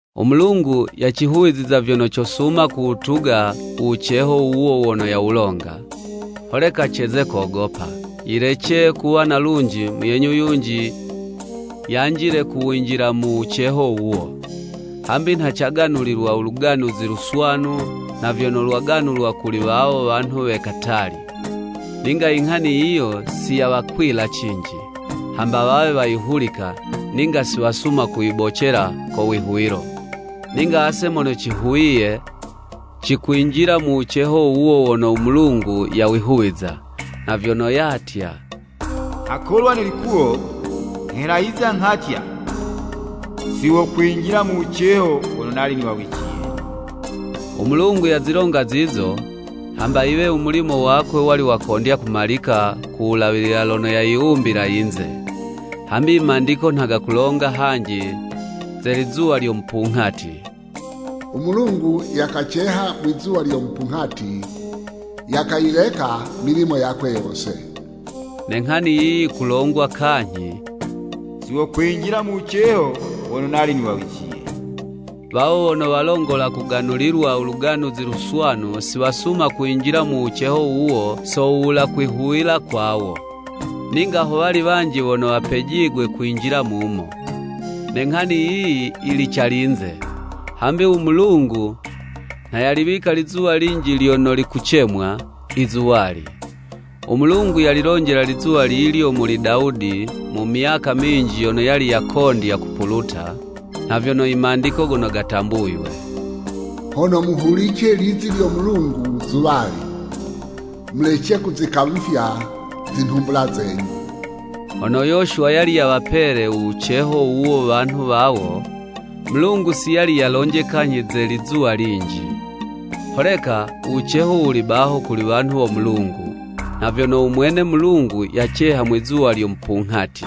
U Mulungu yacihuwiza vyono cosuma kuwutuga u wuceho wuwo wono yawulonga. Holeka ceze kogopa, yilece kuwa na lunji, muyenyu yunji yanjile ku winjila mu wuceho wuwo. Hambi nha caganulilwa u Luganuzi Luswanu nha vyono lwaganulwa kuli wawo wanhu we katali. Ninga i nghani yiyo si yawakwila cinji, hamba wawe wayihulika, ninga si wasuma kuyibocela ko wihuwilo. Ninga ase mono cihuwiye, cikwinjila mu wuceho wuwo wono u Mulungu yawihuwiza. Nha vyono yatya, “Nghakolwa ne likuwo, nghelahiza, nghatya, ‘Si wokwinjila mu wuceho wono nali niwawiciye.’” U Mulungu yazilonga zizo, hamba yiwe u mulimo wakwe wali wakondya kumalika ku wulawilila lono yayiwumbila yinze. Hambi i Mandiko nha gakulonga hanji ze lizuwa lyo mupunghati. “U Mulungu yakaceha mwizuwa lyo mupunghati, yakayileka milimo yakwe yose.” Ne nghani yiyi yikulongwa kanyhi, “Si wokwinjila mu wuceho wono nali niwawiciye.” Wawo wono walongola kuganulilwa u Luganuzi Luswanu si wasuma kwinjila mu wuceho wuwo so wuwula kwihuwila kwawo. Ninga ho wali wanji wono wapejigwe kwinjila mumo. Ne nghani yiyi yili calinze, hambi u Mulungu nha yaliwika lizuwa linji lyono likucemwa “I zuwali.” U Mulungu yalilonjela lizuwa lilyo muli Dawudi mu myaka minji yono yali yakondya kupuluta, nha vyono i Mandiko gono gatambuywe. “Hono muhulice lizi lyo Mulungu zuwali mulece kuzikamufya zinhumbula zenyu.” Hono Yoshuwa yali yawapele u wuceho wuwo wanhu wawo, Mulungu si yali yalonje kanyhi ze lizuwa linji. Holeka u wuceho wuli baho kuli wanhu wo Mulungu, nha vyono u mwene Mulungu yaceha mwizuwa lyo mupunghati.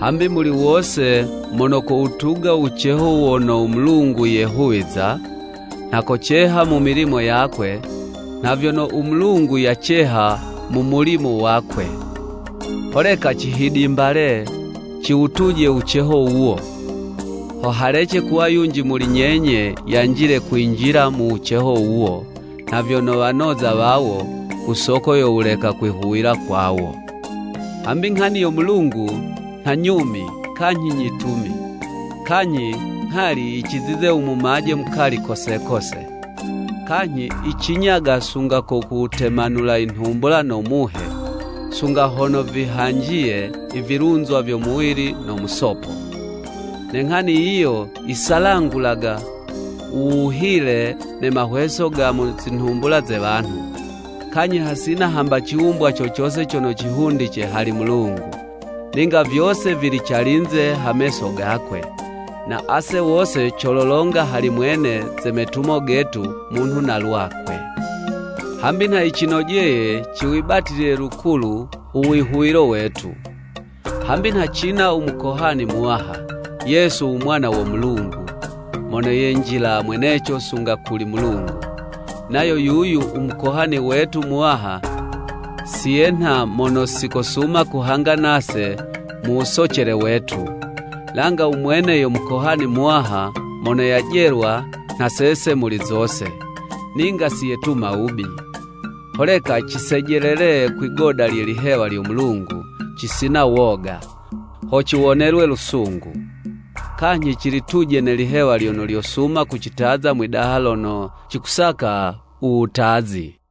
Hambi muli wose mono kowutuga u wuceho wono u Mulungu yehuwiza, nha koceha mu milimo yakwe, nha vyono u Mulungu yaceha mu mulimo wakwe. Holeka cihidimbale, ciwutuje u wuceho wuwo, ho halece kuwa yunji muli nyenye yanjile kuwinjila mu wuceho wuwo, nha vyono wanoza wawo, ku soko yo wuleka kwihuwila kwawo. Hambi nghani yo Mulungu nha nyumi kanyhi nyitumi, kanyhi nghali yicizize u mumaje mukali kose kose, kanyhi yicinyaga sunga ku wutemanula i nhumbula no Muhe, sunga hono vihanjiye i vilunzwa vyo muwili no musopo. Ne nghani yiyo yisalangulaga u wuhile ne mahweso ga mu zinhumbula ze wanhu. Kanyhi hasina hamba ciwumbwa co cose cono cihundice hali Mulungu, ninga vyose vili calinze ha meso gakwe. Na ase wose cololonga hali mwene ze metumo getu munhu na lwakwe. Hambi nha yicinojeye ciwibatilile lukulu u wihuwilo wetu. Hambi nha cina u Mukohani Muwaha, Yesu u Mwana wo Mulungu, mono yenjila mweneco sunga kuli Mulungu. Nayo yuyu u Mukohani wetu Muwaha si yenha mono si kosuma kuhanga nase mu wusocele wetu, langa u mwene yo Mukohani Muwaha mono yajelwa nha sese muli zose, ninga si yetuma wubi. Holeka cisejelele kwi'goda lye lihewa lyo Mulungu, cisina woga, ho ciwonelwe lusungu, kanyhi cilituje ne lihewa lyono lyosuma kucitaza mwidaha lono cikusaka u wutazi.